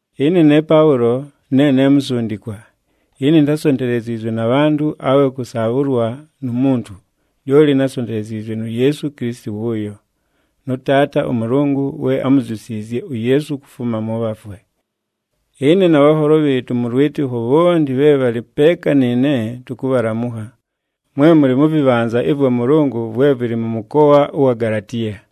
Ɨne ne Paʉlo ne ne musundikwa. Ɨne intásonteleziizwe na bhantʉ awe kʉsaabhʉlwa nu muntu. Lyoli násonteleziizwe nu Yeesu Kilisiti wʉʉyo, nʉ Taata ʉMʉlʉngʉ we ámuzyusiizye uYeesu kufuma mʉ bhafwe. Ɨne na bhanholo bhɨɨtʉ mʉ lwɨtɨkho bhonti bhe bhalɨ peeka nɨɨne tʉkʉbhalamʉkha, mwe mʉlɨ mʉ vɨbhanza ɨvwa Mʉlʉngʉ vwe vɨlɨ mʉ mʉkoa ʉwa Galatiya.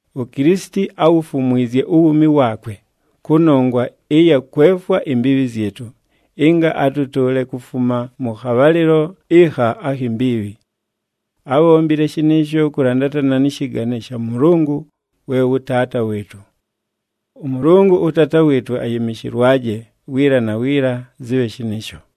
UKilisiti áwufumwizye uwuumi waakwe, kʉnongwa ɨya kwefwa imbiibhi zyɨtʉ, ɨnga atʉtʉʉle kufuma mʉ khabhalɨlo ɨkha akhi mbiibhi. Ábhombile shɨnɨɨsho kʉlandatana nɨ shɨgane sha Mʉlʉngʉ we wʉ Taata wɨɨtʉ. ɄMʉlʉngʉ ʉTaata wɨɨtʉ ayɨmɨshɨlwaje, wiila na wiila! Zɨbhe shɨnɨɨsho.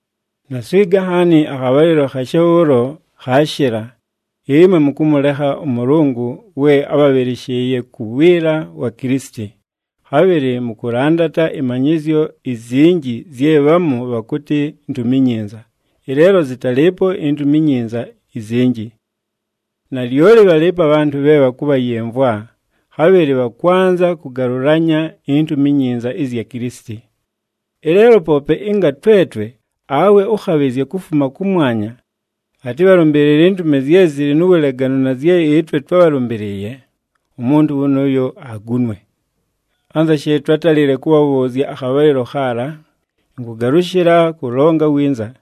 Naswiga nhaani, akhabhalɨlo khashe bhʉʉlo khaashɨla, ɨmwe mʉkʉmʉlekha ʉMʉlʉngʉ we ábhabhɨlɨshɨɨye ku wiila wa Kilisiti, khabhɨlɨ mʉkʉlandata ɨmanyɨzyo izinji zye bhamu bhakʉtɨ Ntumi iNyinza, ɨleelo zɨtalɨɨpo iNtumi iNyinza izinji. Nalyoli bhalɨɨpo abhantʉ bhe bhakʉbhayɨmvwa, khabhɨlɨ bhakwanza kʉgalʉlanya iNtumi iNyinza ɨzya Kilisiti. Ɨleelo, poope ɨnga twetwe awe ʉkhabhɨzya kufuma kʉmwanya atɨbhalʉmbɨɨlɨle intumi zye zɨlɨ nu wuleganu na zye ɨtwe twábhalʉmbɨlɨɨye, umuntu wʉnʉʉyo agunwe! Anza she twátalile kʉbhabhʉʉzya akhabhalɨlo khaala, ɨnkʉgalʉshɨla kʉlonga winza: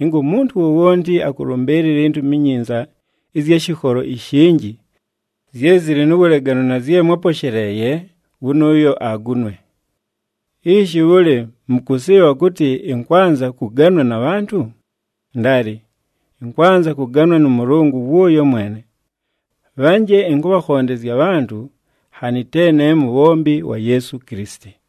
ɨnga umuntu wowonti akʉlʉmbɨɨlɨla iNtumi iNyinza ɨzya shɨkholo ishinji, zye zɨlɨ nu wuleganu na zye mwáposheleeye, wʉnʉʉyo agunwe! Ishi, bhʉlɨ mʉkʉsɨɨbha kʉtɨ ɨnkwanza kʉganwa na bhantʉ? Ndaali! Ɨnkwanza kʉganwa nʉ Mʉlʉngʉ wʉʉyo mwene! Bhanje ɨnkʉbhakhondezya abhantʉ, nhanɨ te ne mubhombi wa Yeesu Kilisiti.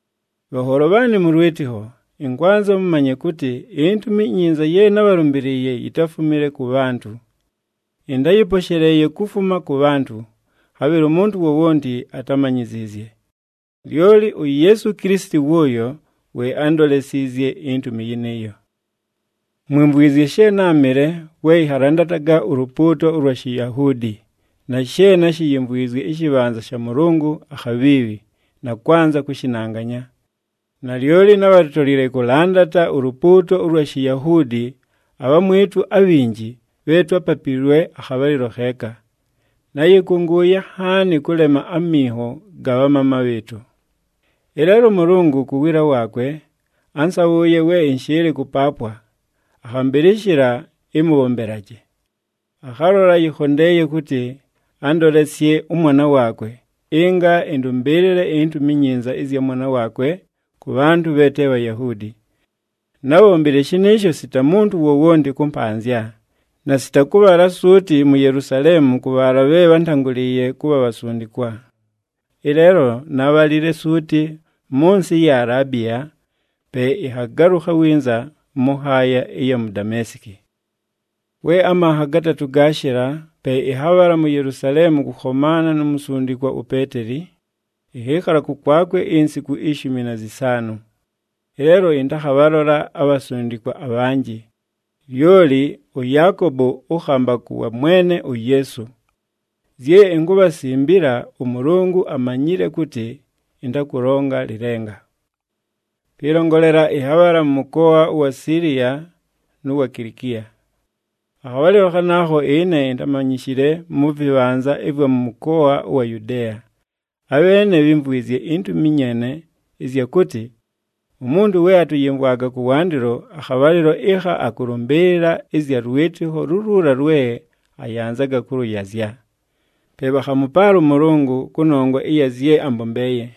Bhanholo bhaanɨ mʉ lwɨtɨkho, ɨnkwanza mʉmanye kʉtɨ, iNtumi iNyinza ye nábhalʉmbɨlɨɨye yitáfumile kʉ bhantʉ. Ɨntáyɨposheleeye kufuma kʉ bhantʉ, khabhɨlɨ umuntu wowonti atámanyiziizye. Lyoli uYeesu Kilisiti wʉʉyo we ándolesiizye intumi yɨnɨɨyo. Mwimvwizye she náamɨle we ɨnhalandataga ulupuuto ʉlwa Shiyahuudi, na she náshiyimvwizye ɨshɨbhanza sha Mʉlʉngʉ akhabhiibhi, na kwanza kʉshɨnanganya. Nalyoli nábhatolile kʉlandata ulupuuto ʉlwa Shiyahuudi abhamwɨtʉ abhinji bhe twápapiilwe akhabhalɨlo kheeka. Náyɨkʉngʉʉye nhaani kʉlema aminho ga bhamaama bhɨɨtʉ. Ɨleelo ʉMʉlʉngʉ, ku wiila waakwe, ánsabhʉʉye we ɨnshɨɨlɨ kʉpaapwa, akhambɨlɨshɨla ɨmʉbhombelaje. Akhalola yɨkhondeeye kʉtɨ andolesye ʉMwana waakwe, ɨnga ɨndʉmbɨɨlɨle iNtumi iNyinza ɨzya Mwana waakwe kʉ bhantʉ bhe te Bhayahuudi. Nábhombile shɨnɨɨsho sita muntu wowonti kʉmpanzya, na sita kʉbhala suuti mu Yelusaleemu kʉ bhaala bhe bhántangʉlɨɨye kʉbha bhasundikwa. Ɨleelo nábhalile suuti mʉ nsɨ ɨya Alaabiya, pe ɨnhagalʉkha winza mʉ nhaaya ɨya mu Dameesiki. We amanha gatatʉ gaashɨla, pe ɨnhabhala mu Yelusaleemu kʉkhomaana nu musundikwa uPeeteli, ɨnhɨɨkhala kʉkwakwe insiku ishumi na zɨsaanʉ. Ɨleelo ɨntakhabhalola abhasundikwa abhanjɨ, lyoli ʉYaakobo ʉkhambakʉ wa Mwene uYeesu. Zye inkubhasimbila, ʉMʉlʉngʉ amanyile kʉtɨ ɨntakʉlonga lɨlenga. Pɨlongolela, ɨnhabhala mʉ mʉkoa ʉwa Siiliya nʉ wa Kilikiya. Akhabhalɨlo khanaakho ɨne intámanyishile mʉ vɨbhanza ɨvwa mʉ mʉkoa ʉwa Yudeeya. Abheene bhímvwizye intumi nyeene ɨzya kʉtɨ, “Umuntu we atʉyɨmvwaga kʉwandɨlo, akhabhalɨlo ɨkha akʉlʉmbɨɨlɨla ɨzya lwɨtɨkho luluula lwe ayanzaga kʉlʉyazya.” Pe bhakhamʉpaala ʉMʉlʉngʉ kʉnongwa ɨya zye ambombeeye.